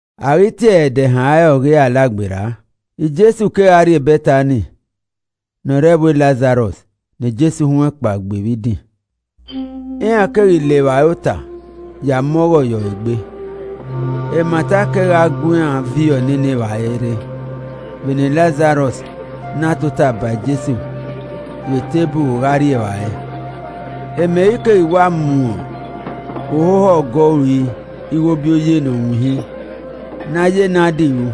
A ghi tie ẹre ẹdẹ ehan re ọ ghi re Alagberra, Jesu kegha rrie Bẹtani ne ọ re ẹvbo Lazarọs ne Jesu huẹn kpaegbe vbe idin. Iran keghi le evbare ota ya mu ọghọ ye ọre egbe, Mata kegha gu iran viọ nene evbare rre vbene Lazarọs na tota ba Jesu vbe eteburu gha rri evbare. Meri keghi wa mu ohoho ọgọ ori ighobioye ne ọ winhin ne a ya nadi ru,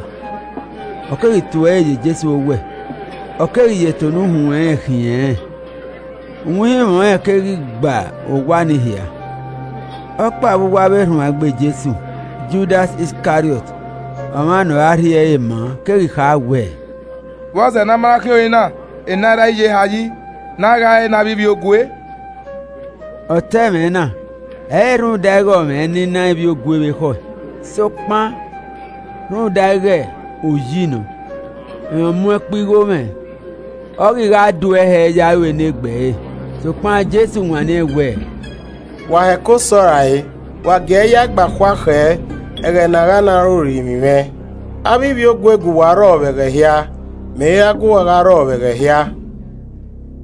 ọ keghi tue ẹre ye Jesu owẹ, ọ keghi ya eto ne uhunmwu ẹnrẹn khiẹn rẹ n. Uwinhinmwẹ ọnrẹn keghi gba owa nii hia. Ọkpa vbe uwu avbe erhuanegbe. Jesu, Judas Iskariọt, ọmwa ne ọ ra rhie ẹre maa keghi kha wẹẹ, “Vbọzẹ ne a ma na khiẹn ori na enaira iyeha yi ne a ghae ẹre ne avbe ivbiogue?” Ọ ta ẹmwẹ na ẹ i re rhunmwuda ighẹ ọ mwẹ ẹnina ivbiogue vbe ekhọe, sokpan rhunmwuda ighẹ oyi nọ, rẹn ọ mu ẹkpo igho mwẹ, ọ ghi gha duẹe hẹ ya ru enegbe ẹre. Sokpan Jesu wanniẹn wẹẹ, “Wa heko sẹ ọe rae! Wa gie ẹe ya ẹe gba khua khẹ ẹghẹ ne a gha na re orinmwi mwẹ. Avbe ivbiogue gu uwa rrọọ ve ẹghẹ hia, mẹ i ra gu uwa gha rrọ ẹghẹ hia.”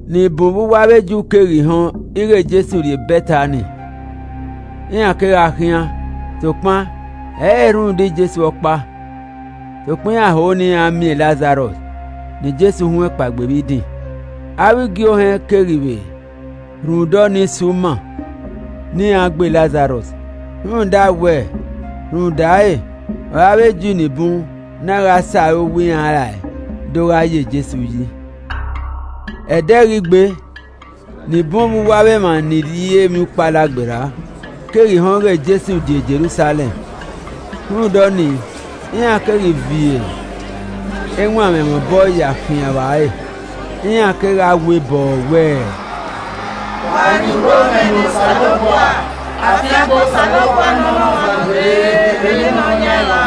Ni bun vbe uwu avbe Ju keghi họn ighẹ Jesu rre Bẹtani, iran kegha khian, sokpan ẹ i re rhunmwuda Jesu ọkpa, sokpan iran ho ne iran miẹn e Lazarọs ne Jesu huẹn kpaegbe vbe idin. Avbe igie ohẹn keghi vbe rhunmwuda ọnii si uma ne iran vbe gbe Lazarọs. Rhunmwuda wẹ, rhunmwuda ẹre ọre avbe Ju ni bun na gha sẹ arowa iran rae do gha ye Jesu yi. Ẹdẹ ghi gbe, ni bun vbe uwu avbe emwa ni rrie Emwiukpo Alagberra keghi họn ighẹ Jesu die Jerusalẹm. Rhunmwuda ọnii, iran keghi viọ ewanmwẹ mwẹ obọ ya khian vba ẹre, iran kegha wee bọọ wẹẹ, “Wa rhie urhomwẹ ne Osanobua. Afiangbe Osanobua nọ ne ọmwa ne ọ dee vbe eni Nọyaẹnmwa.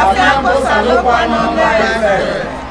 Afiangbe Osanobua nọ ne Ọba Izrẹl.”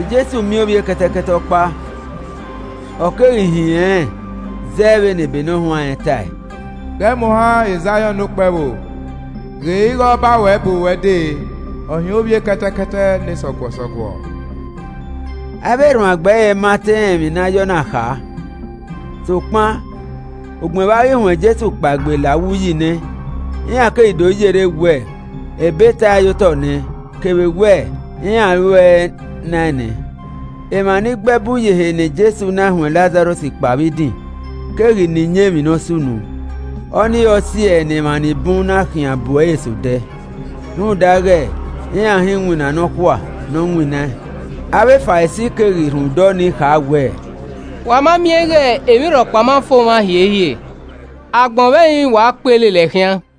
Jesu miẹn ovbi ekẹtẹkẹtẹ ọkpa, ọ keghi hin ẹnrẹn zẹ vbene ebe ne ọ huanrẹn tae: “Ghẹ mu ohan Zaiọn ne okpẹvbo, ghe ighẹ Ọba ruẹ bu ruẹ dee, ọ hin ovbi ekẹtẹkẹtẹ ne sọguọsọguọ.” Avbe erhuanegbe ẹre ma te rẹn emwi ne a ya ọna kha, sokpan ugbẹn vbe a ghi huẹn Jesu kpaegbe la uwu uyi nẹ, iran keghi do yerre wẹ ebe tae ye otọ nẹ, kevbe wẹ iran ruẹe naẹn nẹ. Emwa ni gbe ẹbu ye ehe ne Jesu na huẹn Lazarọs kpao vbe idin keghi na iyẹn emwi ne ọ sunu. Ọnii ọre ọ si ẹe ne emwa ni bun na khian bu ẹre sẹ odẹ, rhunmwuda ighẹ iran họn iwinna nọkhua na ne ọ winnaẹn. Avbe Farisi keghi rhunmwuda ọnii kha wẹẹ, “Wa ma miẹn ighẹ emwi rhọkpa ma fo mwa hiehiere. Agbọn vbe ẹrinmwi wa kpee lele ẹe khian.”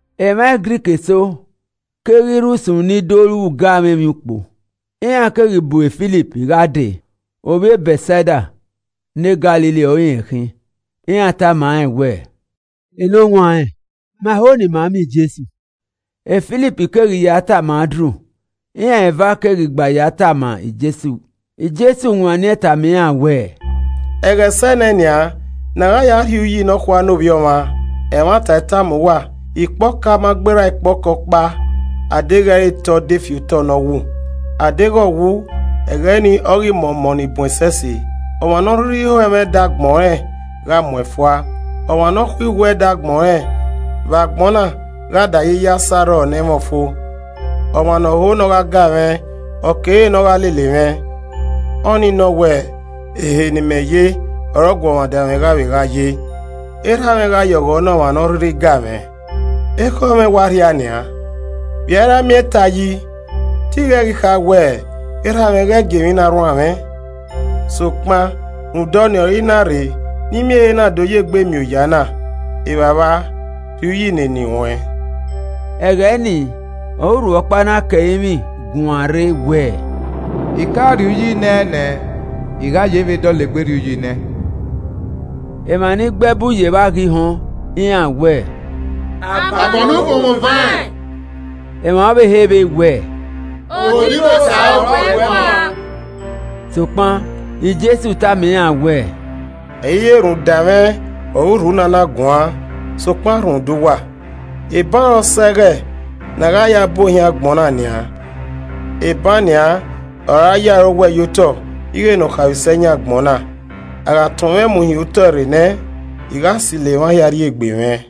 Emwa Grik eso keghi rre usun ni do ru ugamwẹ emwiukpo. Iran keghi bu Filip gha dee (ovbi ẹ Bẹtsaida ne Galili ọre irẹn khin,) iran tama rẹn wẹẹ, “Enọwanrẹn, ma ho ne ima miẹn Jesu.” Filip keghi ya tama Andru, iran eva keghi gba ya tama Jesu. Jesu wanniẹn tama iran wẹẹ, “Ẹghẹ sẹ ne nian ne a gha ya rhie uyi nọkhua ne Ovbi Ọmwa. Ẹmwata I tama uwa, ikpe ọka ọkpa ma gberra ikpẹ ọka ọkpa a deghẹ i re te ọ de fi otọ ne ọ wu, a deghẹ ọ wu, ẹghẹ nii ọ ghi mọ ọmọ ni bun ẹsẹse. Ọmwa ne ọ rhirhi ho ẹmwẹ ẹdẹ agbọn rẹn, gha muẹn fua, ọmwa ne ọ khuiwu ẹdẹ agbọn rẹn vbe agbọn na gha dae yi ya sẹ arrọọ ne ẹ i mwẹ ọfo. Ọmwa ne ọ ho ne ọ gha ga mwẹ, ọ kere ne ogha lele mwẹ, ọnii nọ wẹẹ, ehe ne imẹ ye ọre ọguọmwadia mwẹ gha vbe gha ye. Erha mwẹ gha ye ọghọ ne ọmwa ne ọ rhirhi ga mwẹ. “Ekhọe mwẹ wa rhia nian, vbe i a ra miẹn ta yi, te I ghẹ ghi kha wẹẹ, ‘Erha mwẹ ghẹ gie emwi na rruan mwẹ?’ Sokpan, rhunmwuda ọnii ọre I na rre ne I miẹn ehe na do ya egbe miẹn oya na. Evbavba, rhie uyi ne eni ruẹn!” Ẹghẹ nii ọre urhu ọkpa na ke ẹrinmwi guan rre wẹẹ, “I ka rhie uyi naẹn nẹ, I gha ye vbe dọlegbe rhie uyi ne ẹn.” Emwa ni gbe ẹbu ye evba ghi họn, iran wẹ, “Avan ne ukhunmwu vaẹn!” Emwa ọvbehe vbe wẹẹ, “Odibosa ọre ọ gu ẹe guan.” Sokpan Jesu tama iran wẹẹ, “Ẹ i re rhunmwuda mwẹ ọre urhu na na guan, sokpan rhunmwuda uwa. Eban ọre ọse ẹghẹ ne a gha ya bu ohiẹn agbọn na nian, eban nian, a ra ya ọre owẹ ye otọ ighe nọkhaemwisẹ yan agbọn na. A gha tọn mwẹ mu hin otọe rre nẹ, I gha silo emwa hia rri egbe mwẹ.”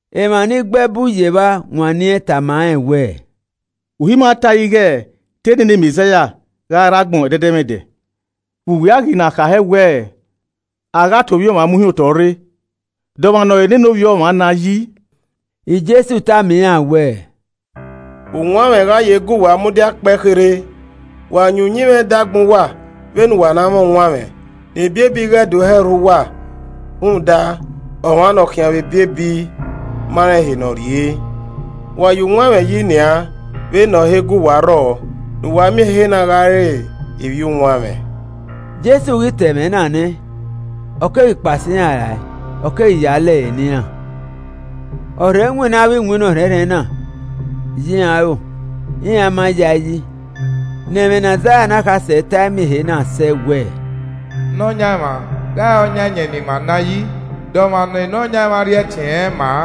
Emwa ni gbe ẹbu ye evba wanniẹn tama rẹn wẹẹ, “Uhi ima tae ighe te nene Mẹzaia gha rre agbọn ẹdẹdẹmwẹdẹ, vbe uwẹ a ghi na kha hẹ wẹẹ, a gha tọn Ovbi Ọmwa mu hin otọe rre? De ọmwa ne ọ re nene Ovbi Ọmwa na yi?” Jesu tama iran wẹẹ, “Uwanmwẹ gha ye gu uwa mudia kpẹe kherhe. Wa yin uyinmwẹ ẹdẹ agbọn uwa vbene uwa na mwẹ uwanmwẹ, ne ebiebi ighe do hẹ rhu uwa rhunmwuda, ọmwa ne ọ khian vbe ebiebi ma rẹn ehe ne ọ rrie. Wa ya uwanmwẹ yi nian vbene ọ na he gu uwa rrọọ, ne uwa miẹn ehe na gha re ivbi uwanmwẹ.” Avbe Ju Ma Yayi Jesu ghi ta ẹmwẹ na nẹ, ọ keghi kpao sẹ iran rae, ọ keghi ya lẹre ne iran. Ọ rhe winna avbe iwinna ọrhẹnrhẹn na ye iran aro, iran ma ya ẹe yi. Ne ẹmwẹ ne Aizaia ne akhasẹ tae miẹn ehe na sẹ wẹẹ, “Nọyaẹnmwa gha ọ ya iyẹn ne ima naẹn yi? De ọmwa ne Nọyaẹnmwa rhie ẹtin ẹnrẹn ma?”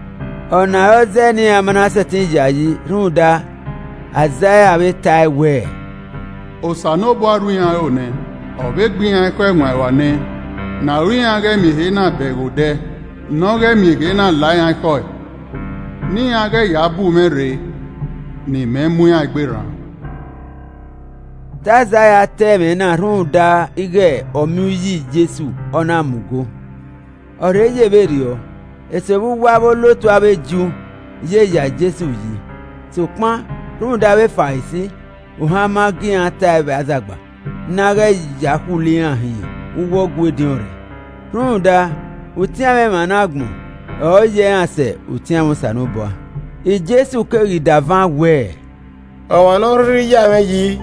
Ọna ọre ọ zẹẹ ne iran ma na sẹtin yayi, rhunmwuda Aizaia vbe tae wẹẹ, “Osanobua rhu iran aro nẹ, ọ vbe gbe iran ekhọe ẹwaẹn ruan nẹ, ne aro iran ghẹ miẹn ehe na bẹghe odẹ, ne ọ ghẹ miẹn ehe na la iran ekhọe, ne iran ghẹ ya bu mwẹ rre ne imẹ mu iran egbe rran.” Te Aizaia ta ẹmwẹ na rhunmwuda ighẹ ọ miẹn uyi Jesu, ọ na mu go. Ọ rhe ye vberriọ, eso vbe uwu avbe olotu avbe Ju ye ya Jesu yi, sokpan rhunmwuda avbe Farisi, ohan ma gie iran tae vbe azagba, ne a ghẹ ya khulo iran hin uwu ọgua ediọn re. Rhunmwuda utianmwẹ emwa ne agbọn ọre ọ yẹ iran sẹ utianmwẹ Osanobua. Jesu keghi da van wẹẹ, “Ọmwa ne ọ rhirhi ya mwẹ yi,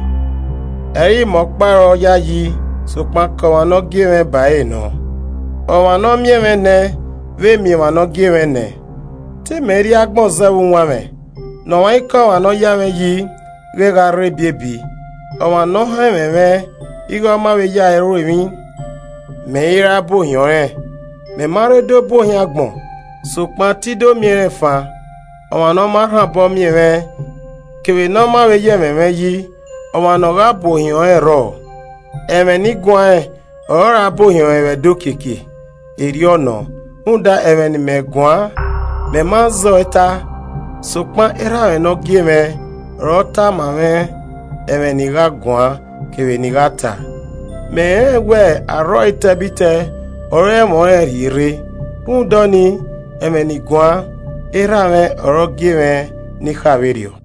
ẹ i re mẹ ọkpa ọre ọ yayi sokpan ke ọmwa ne ọ gie mwẹ ba ẹrẹ nọ. Ọmwa ne ọ miẹn mwẹ ne vbe miẹn ọmwa ne ọ gie mwẹ nẹ. Te imẹ rrie agbọn zẹ vbe uwanmwẹ, ne ọmwaikọmwa ne ọ ya mwẹ yi ghẹ gha rre ebiebi. Ọmwa ne ọ họn ẹmwẹ mwẹ ighẹ ọma vbe ya ẹe ru emwi, mẹ i ra bu ohiẹn ọnrẹn. Mẹ ma rre do bu ohiẹn agbọn, sokpan te I do miẹn rẹn fan. Ọmwa ne ọ ma rhan obọ miẹn mwẹ kevbe ne ọ ma vbe ya ẹmwẹ mwẹ yi, ọmwa ne ọ gha bu ohiẹn ọnrẹn rrọọ. Ẹmwẹ ne I guanrẹn ọre ọ ra bu ohiẹn ọnrẹn vbe ẹdẹ okiekie. Erriọ nọ, rhunmwuda ẹmwẹ ne imẹ guan, mẹ ma zẹ ọe ta, sokpan erha mwẹ ne ọ gie mwẹ ọre ọ ta ma mwẹ ẹmwẹ ne I gha guan kevbe ne I gha ta. Mẹ rẹnrẹn wẹ arrọọ etẹbitẹ ọre ẹmwẹ ọnrẹn rhie rre. Rhunmwuda ọnii, ẹmwẹ ne I guan, Erha mwẹ, ọre ọ gie mwẹ ne I kha vberriọ.”